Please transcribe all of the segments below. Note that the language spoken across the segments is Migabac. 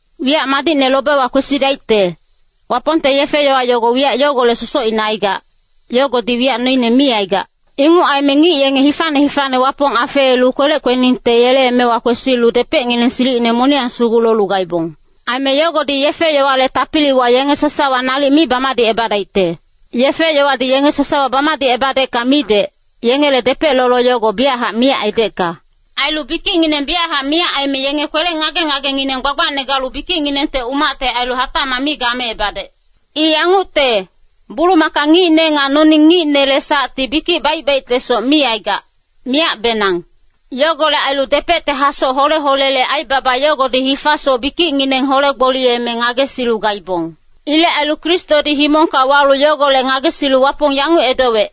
Wiyac madicne lobewa kwesidaicte, Wapongte yefe-yowa yogo wiyac yogolec sosocine aigac, yogodi wiyac noine mi aigac. Inguc aime ngic yenge hifane hifane Wapong afeelu kwelec kweningte yele emewa kwesilu depecngineng silicine moniyang sugu lolu gaibong. Aime yogodi yefe-yowale tapiliwa yenge sasawa nalic mi bamadicebadaicte. Yefe-yowadi yenge sasawa bamadicebadecka midec, yengele depec lolo yogo biyachac miyac aidecka. Ailu bikicngineng biyachac miyac aime yenge kwele ngage-ngagengineng gbagbacne galu bikicnginengte umacte ailu hatacmac mi gameebadec. I yangucte, bulumaka ngicne nga noning ngicnele sacti bikic baic-baictesoc mi aigac, miyacbenang. Yogolec ailu depecte hasoc hole-holele aibaba yogodi hifasoc bikicngineng hole-gboliyeme ngagesilu gaibong. Ilec ailu Kristodi himongka walu yogolec ngagesilu Wapong yanguc edowec,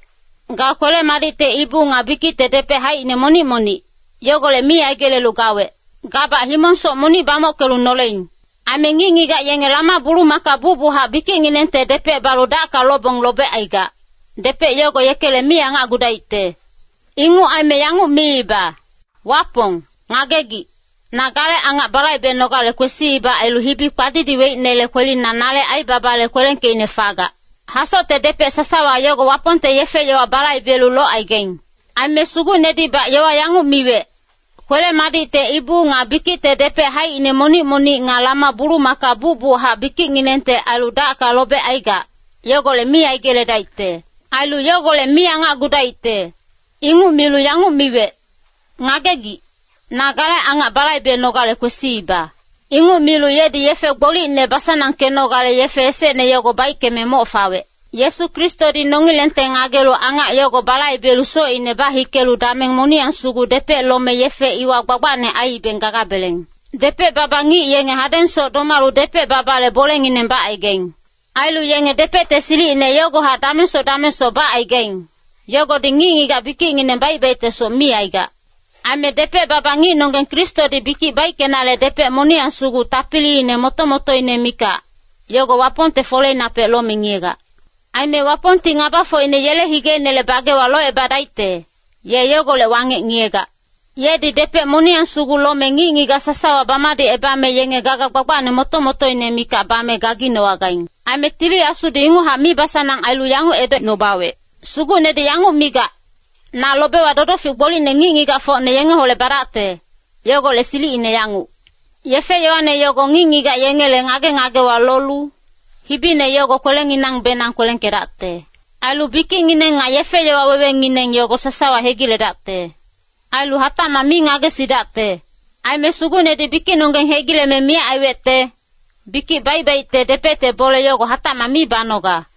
“Ga kwele-madicte ibu nga bikicte depec haicine monic-monic, yogolec mi aigelelu gawec. Gabac himong-soc monic bamockelu noleing. Aime ngic-ngigac yenge lama-bulumaka bucbuchac bikicnginengte depec balu dacka lobong lobecaigac, depec yogo yekele mi angacgudaicte. Inguc aime yanguc miiba, ‘Wapong, ngagegic, na gale angac balaibenogale kwesiiba ailu hibi kpadidiweicnele kwelina nale aibabale kwelengkeicne fagac.’” Hasocte depec sasawa yogo Wapongte yefe-yowa balaibelu locaigaing. Aime Sugucnedibac yowa yanguc miwec, “Kwele-madicte ibu nga bikicte depec haicine monic-monic nga lama-bulumaka bucbuchac bikicnginengte ailu dacka lobecaigac, yogolec mi aigeledaicte. Ailu yogolec mi angacgudaicte.” Inguc milu yanguc miwec, “Ngagegic, na gale angac balaibenogale kwesiiba.” Inguc milu yedi yefe gbolicne basanangkenogale yefe esecne yogo baickeme moc fawec. Yesu Kristodi nongilengte ngagelu angac yogo balaibelu socine bahikelu dameng moniyang sugu depec lome yefe iwa gbagbacne aiibeng gagabeleng. Depec-baba ngic yenge hadengsoc domalu depec-babale bolengineng bacaigaing. Ailu yenge depecte silicine yogohac damengsoc damengsoc bacaigaing, yogodi ngic-ngigac bikicngineng baic-baictesoc mi aigac. Aime depec-baba ngicnonggeng Kristodi bikic baickenale depec moniyang sugu tapiliine moto-motoine mikac, yogo Wapongte foleinapec lome ngiyegac. Aime Wapongti ngabafocine yele higeinele bagewa locebadaicte, ye yogolec wangec ngiyegac. Yedi depec moniyang sugu lome ngic-ngigac sasawa bamadicebame yenge gaga gbagbacne moto-motoine mikac bame gaginowagaing. Aime Tili Asudi inguchac mibasanang ailu yanguc edocnubawec, “Sugucnedi yanguc migac, ‘Na lobewa dodofic gbolicne ngic-ngigacfocne yengeholec badacte, yogolec silicine yanguc. Yefe-yowane yogo ngic-ngigac yengele ngage-ngagewa lolu, hibine yogo kwelenginangbenang kwelengkedacte. Ailu bikicngineng nga yefe-yowa wewengineng yogo sasawa hegiledacte. Ailu hatacmac mi ngagesidacte.’” Aime Sugucnedi bikicnonggeng hegileme miyac aiwecte, bikic baic-baicte depecte bole yogo hatacmac mi banoga.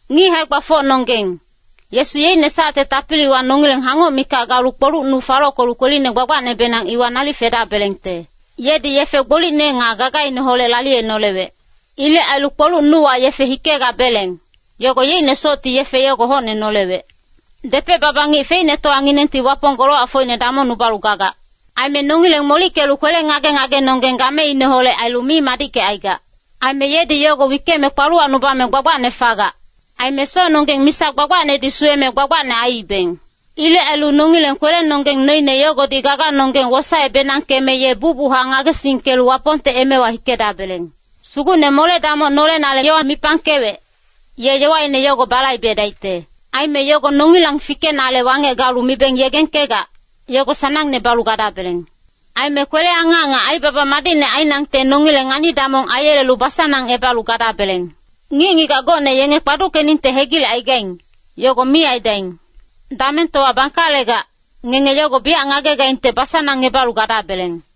Ngic hae-gbafocnonggeng, Yesu yeicne sacte tapiliwa nongileng hangoc mikac galu kpoluc nu falockelu Kweline Gbagbacnebenang iwa nalic fedabelengte. Yedi yefe gbolicne nga gagaineholec laliyenolewec. Ilec ailu kpoluc nuwa yefe hikegabeleng, yogo yeicne socti yefe yogo hocne nolewec. Depec-baba ngic feicnetowanginengti Wapong golowacfocine damongnubalu gagac. Aime nongileng molickelu kwele ngage-ngagenonggeng gameineholec ailu mi madickecaigac. Aime yedi yogo wickeme kpaluwacnubame gbagbacne fagac. Aime socnonggeng misa gbagbacnedi suweme gbagbacne aiibeng. Ilec ailu nongileng kwelenonggeng noine yogodi gaganonggeng wosae-benangkeme ye bucbuchac ngagesingkelu Wapongte emewa hikedabeleng. Sugucne mole-damoc nolenale yowa mipangkewec, ye yowaine yogo balaibedaicte. Aime yogo nongilang fikenale wangec galu mibeng yegengkegac, yogo sanangne balu gadabeleng. Aime kwele-angac nga aibaba madicne ainangte nongileng ngani-damong aiyelelu basanangebalu gadabeleng. Ngic-ngigac gocne yenge kpaduckeningte hegilecaigaing, yogo mi aidaing. Damengtowa bangkalegac, ngenge yogo biyac ngagegaingte basanangebalu gadabeleng.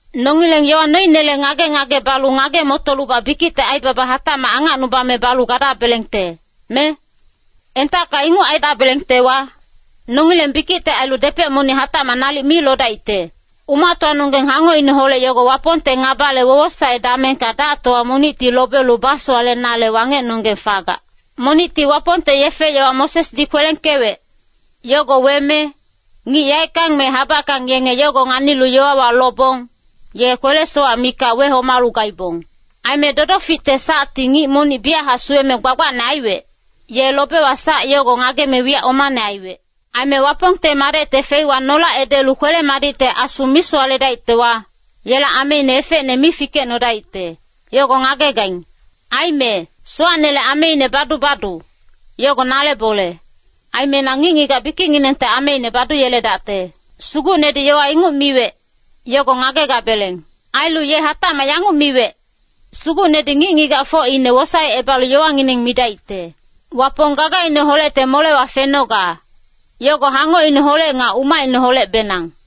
Nongileng yowa noinele ngage-ngage balu ngage-motolubac bikicte aibaba hatacmac angacnubame balu gadabelengte, me? Entacka inguc aidabelengtewa, nongileng bikicte ailu depec monic hatacmac nalic mi lodaicte. Umactowanonggeng hangocineholec yogo Wapongte ngabale wowosae damengka dactowa monicti lobelu basowalenale wangecnonggeng fagac. Monicti Wapongte yefe-yowa Mosesdi kwelengkewec, yogo weme, ngic yaeckang me habackang yenge yogo nganilu yowawa lobong, ye kwele-sowac mikac wehomalu gaibong. Aime dodoficte sacti ngic monic biyachac suweme gbagbacne aiwec, ye lobewa sac yogo ngageme wiyac omane aiwec. Aime Wapongte Madecte feiwa nolac edelu kwele-madicte Asu misowaledaictewa, yela ameine efecne mi fikecnodaicte, yogo ngagegaing. Aime “Sowacnele ameine badu-badu, yogo nale bole. Aime na ngic-ngigac bikicnginengte ameine baduyeledacte.” Sugucnedi yowa inguc miwec, yogo ngagegabeleng. Ailu ye hatacmac yanguc miwec, “Sugucnedi ngic-ngigacfocine wosaecebalu yowangineng midaicte.” Wapong gagaineholecte molewa fenoga, yogo hangocineholec nga umacineholecbenang.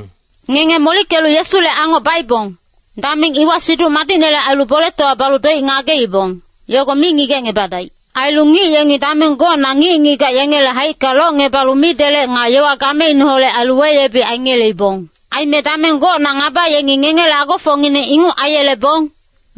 Ngenge molickelu Yesule angoc baibong, dameng iwa Siduc Madicnele ailu boletowa balu doic ngageibong, yogo mi ngigecngebadaic. Ailu ngic yengi dameng gocna ngic-ngigac yengele haicka locngebalu midelec nga yowa gameineholec ailu weyebic aingeleibong. Aime dameng gocna ngaba yengi ngengele agofocngineng inguc aiyelebong,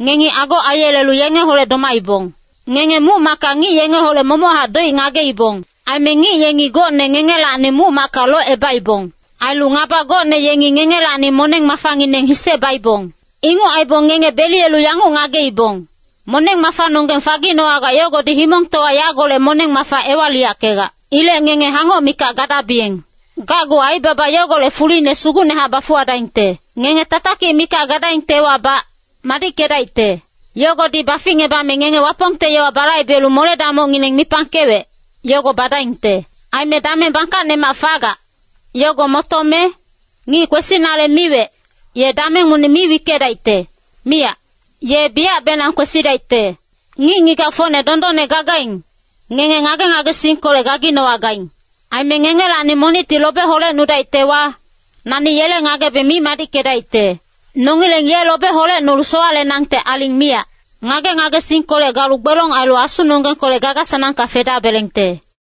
ngengi ago aiyelelu yengeholec domaibong. Ngenge muc-macka ngic yengeholec momochac doic ngageibong. Aime ngic yengi gocne ngengelacni muc-macka locebaibong. Ailu ngaba gocne yengi ngengelacni moneng-mafangineng hise baibong. Inguc aibong ngenge beliyelu yanguc ngageibong, moneng-mafanonggeng faginowagac yogodi himongtowa yagolec moneng-mafa ewaliyackegac. Ilec ngenge hangoc mikac gadabiyeng. Gacgu aibaba yogolec fuline sugucnehac bafuwadaingte. Ngenge tatakic mikac gadaingtewabac, madickedaicte. Yogodi baficngebame ngenge Wapongte yowa balaibelu mole-damocngineng mipangkewec, yogo badaingte. Aime dameng bangkacnemac fagac, yogo motome, “Ngic kwesinale miwec, ye dameng monic mi wickedaicte, miyac. Ye biyacbenang kwesidaicte. Ngic-ngigacfocne dondonne gagaing, ngenge ngage-ngagesingkolec gaginowagaing. Aime ngengelacni monicti lobe holecnudaictewa, nani yele ngagebe mi madickedaicte.” Nongileng ye lobe holecnolu sowalenangte aling miyac. Ngage-ngagesingkolec galu gbelong ailu asunonggengkolec gaga-sanangka fedabelengte.